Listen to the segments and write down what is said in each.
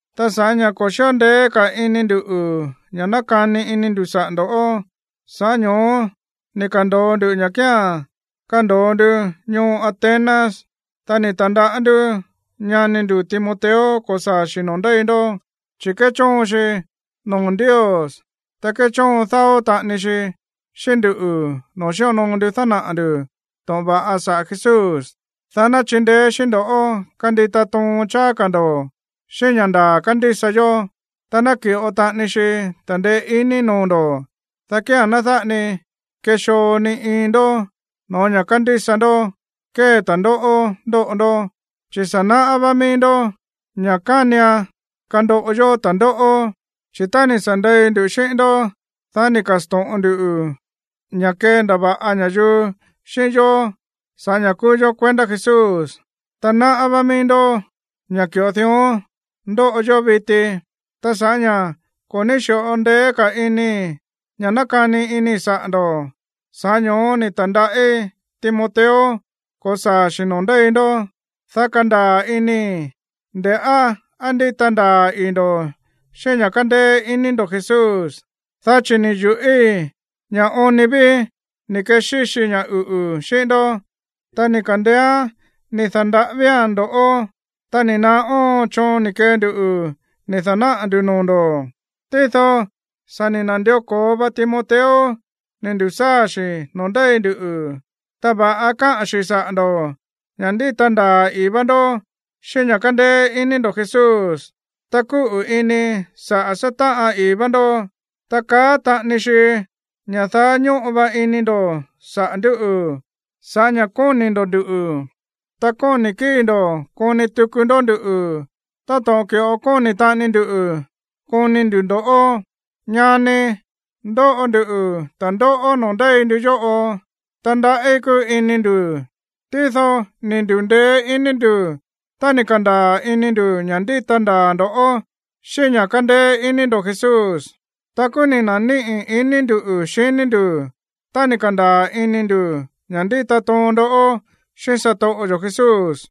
Ta sa̱ꞌá ña̱ ko̱ xíꞌo ndeé ka̱ iní ndu̱ ña̱ nákani ini ndu̱ saꞌa̱ ndo̱, sa̱ꞌá ño̱ó ni̱ ka̱ndo̱o ndu ña̱ kía̱n kándo̱o ndu ñoo Atenas, dá ni̱ ta̱ndaꞌá ndú ñani ndu̱ Timoteo ko̱saa̱ xi̱ noo̱ ndéi ndó, chi̱ kéchóon xi noo̱ Ndios, ta kéchóon dáó taꞌani xi xíꞌín ndú no̱ó xíonoo ndu dánaꞌa̱ ndu̱ to̱ꞌon va̱ꞌa saꞌa̱ Jesús. Dá ná chindeé xí ndo̱ꞌó kandita toon cháá ka̱ ndo̱ xíꞌín ña̱ ndaa̱ kándísa yó, ta ná ki̱ꞌo taꞌani xi ta̱ndeé iní noo̱ ndo̱, dá kía̱n ná dáꞌa ni kexoo ni iin ndó no̱ó ña̱ kándísa ndó kée ta̱ndóꞌó ndóꞌo ndó, chi̱ sa̱ náꞌá vá mií ndó ña̱ kánian kandoꞌo yó ta̱ndóꞌó. Chi̱ tá ni̱ sa̱ ndei ndu xíꞌín ndoꞌó, dá ni̱ ka̱sto̱ꞌon ndu ña̱ kendava̱ꞌa ña̱yuu xíꞌín yó sa̱ꞌá ña̱ kúú yó kuendá Jesús, ta náꞌá va̱ꞌa mií ndó ña̱ ki̱ꞌo dión ndóꞌo yó viti. Ta sa̱ꞌá ña̱ ko̱ ní xi̱ꞌo ndeé ka̱ inii̱ ña̱ nákani inii̱ saꞌa̱ ndo̱, sa̱ꞌá ño̱ó ni̱ ta̱ndaꞌí Timoteo ko̱saa̱ xi̱ no̱ó ndéi ndó, dá kandaa̱ inii̱ nde̱ꞌá á ndíta ndaa̱ ii̱ ndo̱ xíꞌín ña̱ kándéé iní ndo̱ Jesús. Dá chi̱ ni̱ yu̱ꞌíi̱ ña̱ oon ni ví ni̱ kexíxi ña̱ uꞌu̱ xíꞌín ndó, ta ni̱ ka̱ndeéán ni̱ da̱nda̱ꞌávía̱n ndo̱ꞌó, ta ni̱ naá óon choon ni̱ kee ndu ni̱ da̱náꞌa̱ ndu̱ noo̱ ndo̱. Tído sa̱ ni̱ na̱ndió ko̱o va Timoteo ni̱ ndu̱sáa̱ xi̱ noo̱ ndéi ndu. Ta va̱ꞌa káꞌa̱n xi̱ saꞌa̱ ndo̱, ña̱ ndíta ndaa̱ ii̱ va ndó xíꞌín ña̱ kándéé iní ndo̱ Jesús. Ta kúꞌu̱ ini saꞌa̱ sátáꞌan ii̱ va ndó. Ta kaá taꞌani xi ña̱ daá vá ñóꞌo va ini ndo̱ saꞌa̱ ndú sa̱ꞌá ña̱ kóni̱ ndo̱ ndú, ta kóni̱ kíi̱ ndo̱ koni tuku ndó nduꞌu̱, táto̱ꞌon ki̱ꞌo kóni̱ taꞌani nduꞌu̱ koni ndu̱ ndo̱ꞌó. Ñani, ndóꞌo ndu ta̱ndóꞌó no̱ó ndéi ndu yóꞌo, ta ndaꞌí kúu ini ndu̱, tído ni̱ ndu̱ndeé iní ndu̱ tá ni̱ ka̱ndaa̱ ini ndu̱ ña̱ ndíta ndaa̱ ndo̱ꞌó xíꞌín ña̱ kándéé iní ndo̱ Jesús. Ta kúú ni̱ na̱níꞌi̱ ini ndu̱, xiní ndu̱, tá ni̱ ka̱ndaa̱ ini ndu̱ ña̱ ndíta toon ndó xíꞌín satoꞌo yo̱ Jesús.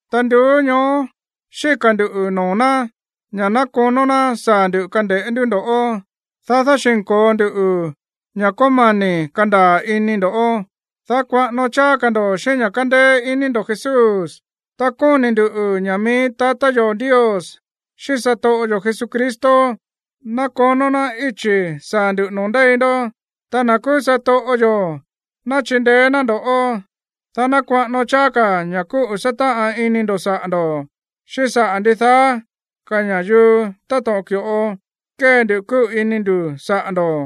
ta nduú ñoó xíka̱ nduꞌu̱ noo̱ ná ña̱ ná konó ná saa̱ ndu̱ kande̱ꞌé ndú ndo̱ꞌó, dá dáxi̱nko̱o ndu ña̱ kómani̱ kandaa̱ ini ndo̱, dá kuaꞌano cháá ka̱ ndo̱ xíꞌín ña̱ kándéé iní ndo̱ Jesús. Ta kóni̱ nduꞌu̱ ña̱ mií tatá yo̱ Ndios xíꞌín satoꞌo yo̱ Jesucristo ná konó ná íchi̱ saa̱ ndu̱ noo̱ ndéi ndó. Ta na̱ kúú satoꞌo yo̱ ná chindeé ná ndo̱ꞌó, dá ná kuaꞌano cháá ka̱ ña̱ kúꞌu̱ sátáꞌan ini ndo̱ saꞌa̱ ndo̱ xíꞌín saꞌa̱ ndidaá ka̱ ña̱yuu táto̱ꞌon ki̱ꞌo kée nduꞌu kúꞌu̱ ini ndu̱ saꞌa̱ ndo̱,